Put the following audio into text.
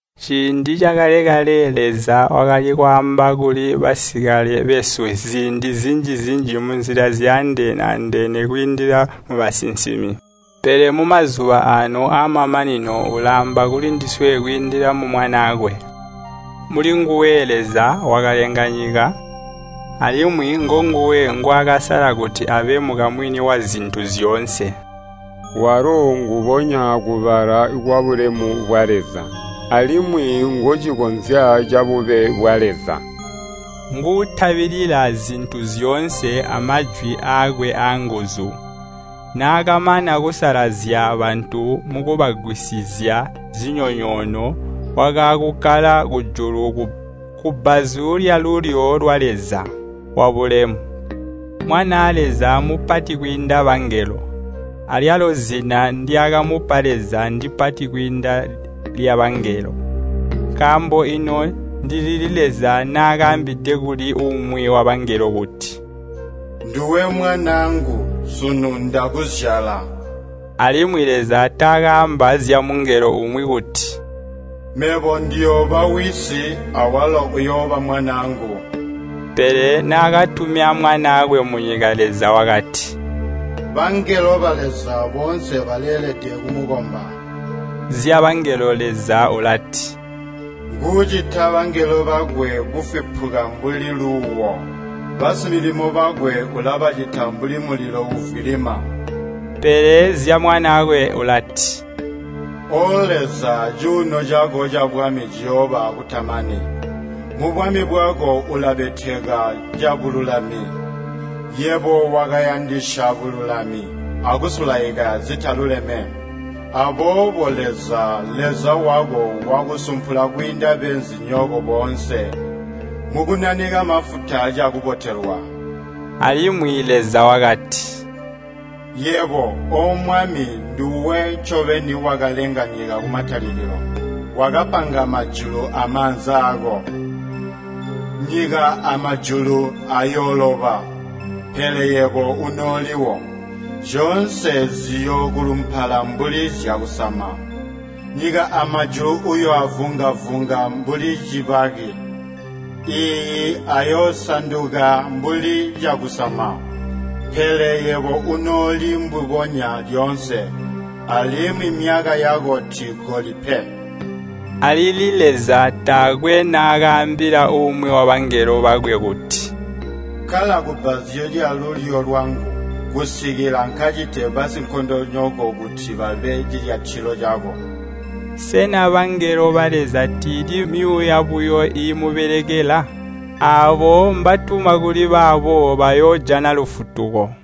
Ciindi cakale-kale Leza wakali kwaamba kuli basikale besu ziindi zinji-zinji munzila zyaandene-andene kwiindila mubasinsimi, pele mumazuba aano aamamanino ulaamba kulindiswe kwiindila mu Mwanaakwe. Mulinguwe Leza wakalenga nyika, alimwi ngonguwe ngwaakasala kuti abe mukamwini wazintu zyoonse. Walo nguubonya kubala kwabulemu bwa Leza, alimwi ngocinkozya cabube bwa Leza. Nguutabilila zintu zyoonse amajwi aakwe aanguzu. Naakamana kusalazya bantu mukubagwisizya zinyonyoono, wakaakukkala kujulu kubbazu lyalulyo lwa Leza Wabulemu. Mwanaa Leza mupati kwiinda bangelo, alyalo zina ndyaakamupa Leza ndipati kwiinda lyabangelo. Nkaambo ino ndilili Leza naakaambide kuli umwi wabangelo kuti, “Nduwe mwanaangu, sunu ndakuzyala?” Alimwi Leza taakaamba zyamungelo umwi kuti, “Mebo ndiyooba wisi, awalo uyooba mwanaangu.” Pele naakatumya Mwanaakwe munyika, Leza wakati, “Bangelo ba Leza boonse baleelede kumukomba.” Zyabangelo Leza ulati, “Nguucita bangelo bakwe kufwipuka mbuli luuwo, Basimilimo bakwe ulabacita mbuli mulilo uuvwilima.” Pele zya Mwanaakwe ulati, “O Leza, cuuno cako cabwami ciyooba akutamani. Mubwami bwako ulabeteka cabululami. Yebo wakayandisya bululami akusulaika zitaluleme. Aboobo Leza, Leza wako, wakusumpula kwiinda beenzinyoko boonse mukukunanika mafuta cakubotelwa.” Alimwi Leza wakati, “Yebo, O Mwami, nduwe ncobeni wakalenga nyika kumatalikilo. Wakapanga majulu amaanza aako. Nyika amajulu ayooloba, pele yebo unooliwo. Zyoonse ziyookulumpala mbuli zyakusama. Nyika amajulu uyooavunga-vunga mbuli cibaki. Iiyi, ayoosanduka mbuli cakusama. Pele yebo unooli mbubonya lyoonse, alimwi myaka yako tiigoli pe.” Alili Leza taakwe naakaambila umwi wabangelo bakwe kuti, “Kkala kubbazu lyalulyo lwangu kusikila nkacite basinkondonyoko kuti babe cilyatilo cako.” Sena bangelo ba Leza tiili myuuya buyo iimubelekela? Aabo mbatuma kuli baabo bayoojana lufutuko.